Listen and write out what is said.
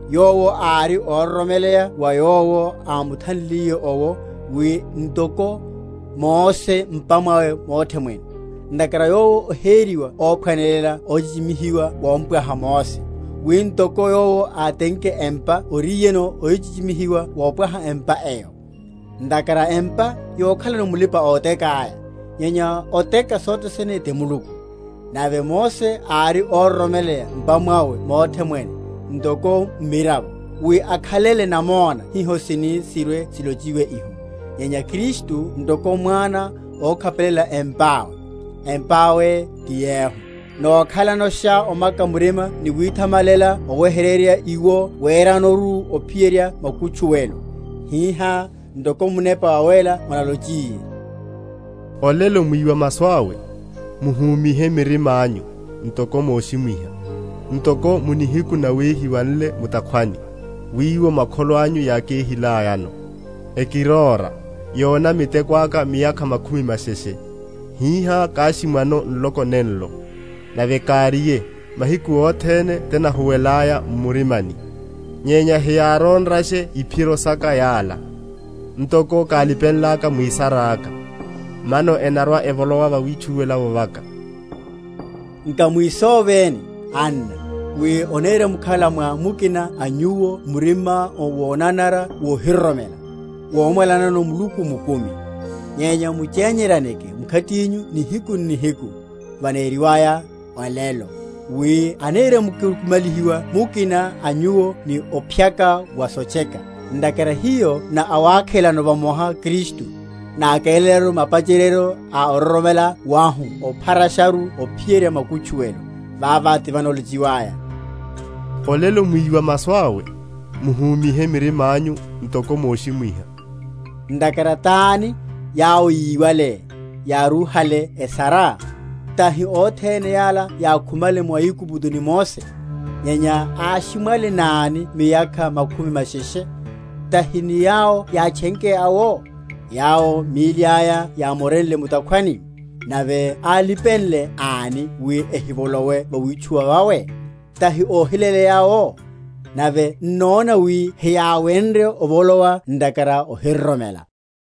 Yowo ári óroromeleya wa Yowo ámuthanlile owo, wi ntoko, Mose m’pa mwawe mothe mwene. Ntakhara Yowo oheriwa óphwanelela ochichimihiwa wompwaha Mose, wi ntoko yowo átenke empa oriyeno ochichimihiwa wopwaha empa eyo. Ntakhara empa yokhalano mulipa‐otekáya; nyenya oteka sothe sene ti Muluku. Nave Mose ári óroromeleya m’pa mwawe mothe mwene, ntoko mmiravo, wi akhalele namona hiho sini sirwe?-?silochiwe iho; nyenya Kristu ntoko mwana, ókhapelela empa awe; empa awe ti yehu, nakhalashano omaka murima ni withamalelela oweheryerya iwo weranoru ophiyerya makutchuwelo. Hihá, ntoko Munepa Wawéla analocheliye, Olelo mwíwa masu awe, Muhúmihe mirimányu, ntoko moshimwiha, Ntoko mu nihiku nawehiwa nle mu’takhwani, Wiwo makholo anyu yákéhilayano, Ekiróra, Yona miteko aka miyakha makhumi masheshe. Hihá káshimwano nloko nenlo, Nave káriye, Mahiku othene tinahuwelaya m’murimani; Nyenya heyárónrashe iphiro saka yala; Ntoko kálipenlaka mwisaráka, Mano enarwa‐evolowa vawitchuwela vaka. Nkamwisoveni, anna, wi onirimkhala mwa mukina a nyuwo murima wonanara wohiroromela, womwalanano Muluku mukumi; nyenya muchenyeryaneke mkhatinyu nihiku n’nihiku, vaneriwaya, Olelo; wi anirimkukumalihiwa mukina a nyuwo ni ophyaka wa sotcheka; ntakhara hiyo na awakhelano vamoha Kristu, nakélelaru mapacheryeryo a ororomela wahu opharasharu ophiyerya makutchuwelo; vava tivanalochiwaya, Olelo mwíwa masu awe, Muhúmihe mirimányu, ntoko moshimwiha. Ntakhara tani, yawo yíwale, yárúhale esara? Tahi othene yala yákhumale mu Aigupto ni Mose? Nyenya áshimwale náni miyakha makhumi masheshe? Tahi ni yawo yátchenke awo, yawo míli aya yámonre mu’takhwani? Nave álipenle ani wi ehivolowe vawitchuwela vawe? Tahi óhiléleya awo? Nave n’nona wi heyáwenrye ovolowa ntakhara ohiroromela.